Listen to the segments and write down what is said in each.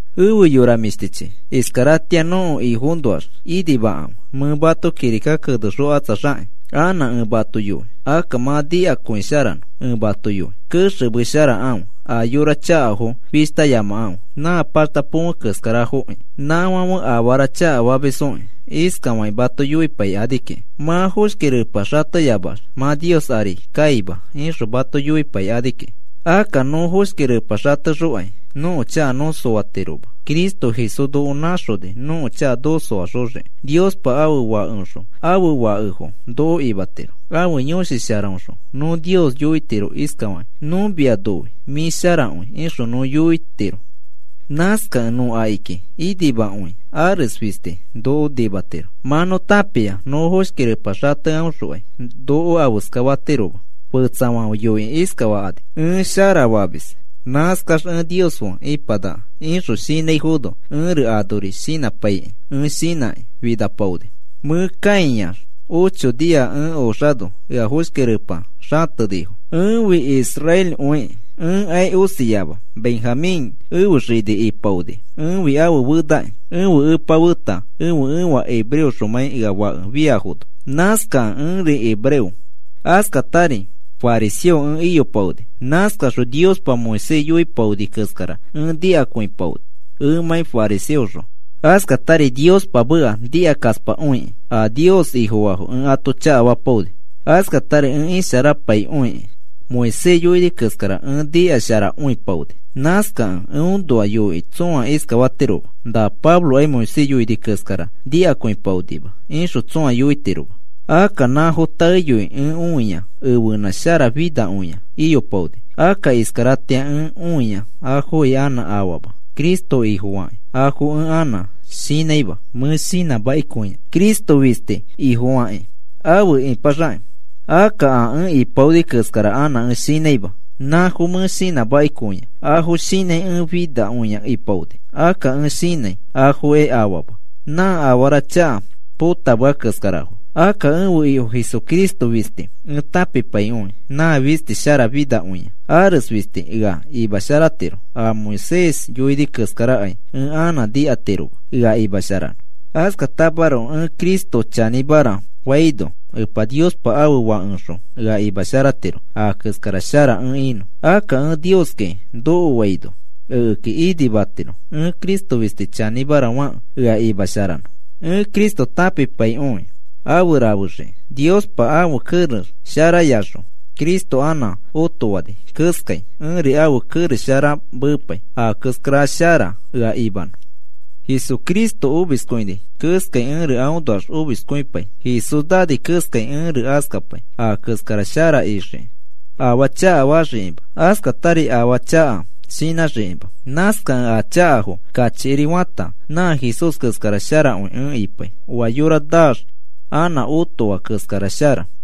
Efe yora mĩshtichi, iskaratĩa nõko Ifoõnoax inimakãfe. Mẽ mato kirika kenexokatsaxakĩ, anã ẽ mato yoi. Akka mã nikakõisharanõ ẽ mato yoi. Kexemesharakãfe, a yora chakafo fishtayamakãfe, nã paxta põfe keskarafoki. Nãfãfe afara chakafamisfoki. Iskafakĩ mato yoipaikani kiki: “Mã foshki repa xateyamax mã Nios ari kaima,” ixõ mato yoipaikani kiki. Akka nõ foshki repa xatexokai nõko chaka nõ soatiroma. Cristo Jesús noko nãxoni nõko chaka noko soaxoxiki. Niospa ãfe Fakeõxõ ãfe fakefo noko imatiro. Ãfe Yõshi Sharaõxõ nõ Nios yoitiro iskafakĩ: “Nõ mia noi. Mĩ sharakõi,” ixõ nõ yoitiro. Nãskakẽ nõ akiki inimakõi ares fisti noko nimatiro. Mã nõ tãpia nõ foshki repa xateaõxokai noko afeska fatiroma. Fetsafãfe yoikĩ iskafakani: “Ẽ shara famis. Nãskax ẽ Nios fe ĩpanaka,” ixõ shinãifono, ẽri anori shinãpaiki ẽ shinãkĩ finapaoni. Mẽ kãiax ocho nia ẽ oxano ea foshki repa xatenifo. Ẽfi israelikõikĩ, ẽkai osiama. Benjamín ẽfe xini ipaoni, ẽfi ãfe fenaki. Ẽfe epa feta ẽfe ẽfa hebreoxomãi ea fake fiafono, nãskakẽ ẽri hebreo. Askatari fariseo ẽ iyopaoni, nãskaxõ Niospa Moisés yoipaoni keskara ẽ nikakõipaoni ẽmãi fariseoxõ. Askatari Niospa meka nikasharapaikõikĩ a Nios Ifofaafo ẽ ato chakafapaoni. Askatari ẽ isharapaikõikĩ Moisés yoini keskara ẽ nikasharakõipaoni. Nãskakẽ eõnoa yoikĩ tsõa iskafatiroma: “Na Pablokai Moisés yoini keskara nikakõipaonima,” ixõ tsõa yoitiroma. Akka nãfo taeyoi ẽ õia ẽfenã sharafinakõia iyopaoni. Akka iskaratĩa ẽ õia afokai anã afama. Cristo Ifofakĩ afo ẽ anã shinãima mẽ shinãmakikõia. Cristo fisti Ifofakĩ afe ĩpaxakĩ. Akka a ẽ ipaoni keskara anã ẽ shinãima. Nãfo mẽ shinãmakikõia, afo shinãi ẽ finakõia ipaoni. Akka ẽ shinãi afokai afama, nã afara chaka potamea keskarafo. Akka ẽfe Ifo Jesucristo fisti ẽ tãpipaikõi, nãfi sharafinakõiaki. Ares fisti ea imasharatiro, a Moisés yoini keskarakai ẽ anã nikatiroma ea imasharanõ. Askatamaroko ẽ Cristo chanĩmara faino Epa Niospa ãfe Fakeoxõ ea imasharatiro a keskara shara ẽ inõ. Akka ẽ Nioski nokoaino ekeki inimatiro, ẽ Cristo fisti chanĩmara fakẽ ea imasharanõ. Ẽ Cristo tãpipaikõi afe rafesharaxiki. Niospa ãfe kerex sharayaxõ Cristo anã otofani keskai, ẽri ãfe kerex shara mepai a keskara shara ea imanõ. Jesucristo omiskõini keskai ẽri aõnoax omiskõipai. Jesús naani keskai ẽri askapai a keskara ixiki, afaa chakafaxikima, askatari afaa chaka shinãxikima. Nãskakẽ a chakafo kachikiri fata, nã Jesús keskara sharakõi ẽ ipai, oa yora naax anã otoa keskara shara.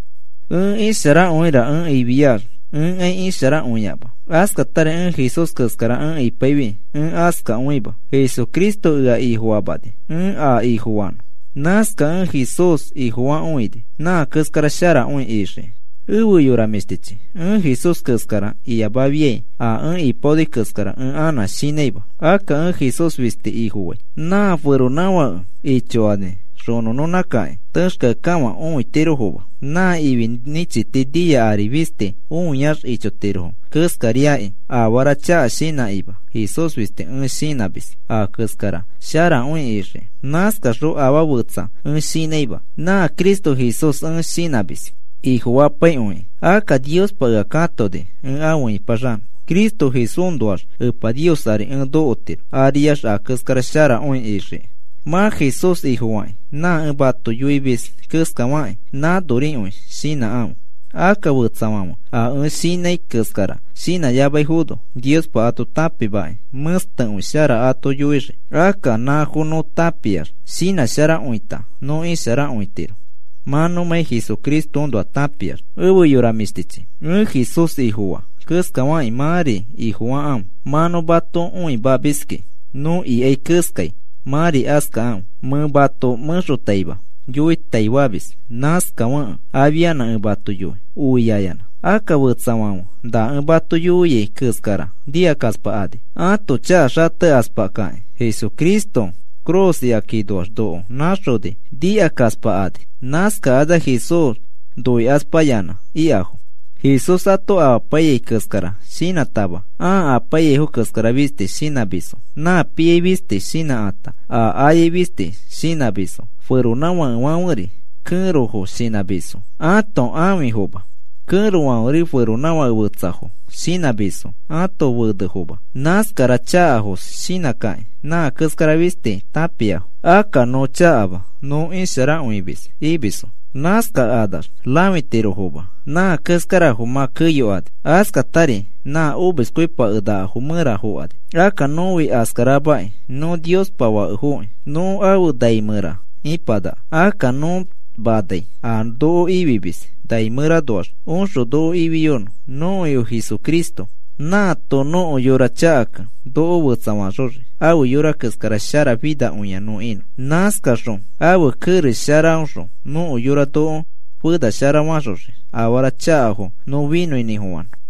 Ẽ isharakõira ẽ ifiax ẽkai isharakõiama. Askatari Jesús keskara ẽ ipaifi ẽ askakõima. Jesucristo ea Ifofamani ẽ a Ifofanõ. Nãskakẽ ẽ Jesús Ifofakõini a keskara sharakõi ixiki. Efe yora mĩshtichi, ẽ Jesús keskara iyamafiai a ẽ ipaoni keskara ẽ anã shinãima. Akka ẽ Jesús fisti Ifofai. Nã feronãfakefo ichokani xonõnõnãkĩ texkeakekafã õitirofoma. Nã ifi nĩchiti nia ari fisti õiax ichotirofo keskariakĩ afara chaka shinãkima Jesús fisti ẽ shinãmis a keskara sharakõi ixiki. Nãskaxõ afaa fetsa ẽ shinãima. Nã Cristo Jesús ẽ shinãmis Ifofapaikõikĩ. Akka Niospa ea katoni ẽ afe ĩpaxanõ, Cristo Jesúsõnoax Epa Nios ari ẽ nokotiro, ariax a keskara sharakõi ixiki. Mã Jesús Ifofakĩ nã ẽ mato yoimis keskafakĩ nãnorikõi shinãkãfe. Akka fetsafãfe a ẽ shinãi keskara shinãyamaifono, Niospa ato tãpimakĩ mẽstekõi shara ato yoixii. Akka nãfo nõ tãpiax, shinãsharakõita nõ isharakõitiro, mã nõmãi Jesucristoõnoa tãpiax. Efe yora mĩshtichi, ẽ Jesús Ifofaa keskafakĩ mãri Ifofakãfe. Mã nõ mato õimamiskĩ, nõ ikai keskai mãri askakãfe. Mẽ mato mẽxotaima yoitaifamis, nãskafekẽ afianã ẽ mato yoi oiayanã. Akka fetsafãfe na ẽ mato yoiai keskara nikakaspakani. Ãto chaka xatekaspakakĩ Jesucristo ifi cruz ikakinoax noko nãxoni nikakaspakani. Nãskakanax Jesús noikaspayanã ikafo. Jesús ato amapaiyai keskara shinãtama ãa apaiyaifo keskara fisti shinãmisfo. Nã piai fisti shinãkata, a ayai fisti shinãmisfo. Feronãfakefãferi kẽrofo shinãmisfo, ãto ãfifoma. Kẽrofãferi feronãfake fetsafo shinãmisfo ãto fenefoma. Nãskara chakafos shinãkĩ, nã keskara fisti tãpiafo. Akka nõ chakama, nõ isharakõimis imisfo. Nãskakanax rãfitirofoma, nã keskarafo mã keyokani. Askatari nã omiskõipakenakafo mẽra fokani. Akka nõfi askaramakĩ, nõ Niospa fakefokĩ nõ afe nai mẽra ĩpanaka. Akka nõ manai a noko Ifimis nai mẽranoax oxõ noko ifiyonõ, nõko Ifo Jesucristo. Nãato nõko yora chakakẽ noko fetsafaxoxii afe yora keskara sharafinakõia nõ inõ. Nãskaxõ ãfe kerex sharaõxõ nõko yora noko fenasharafaxoxii afara chakafo nõ finõinĩfofanõ.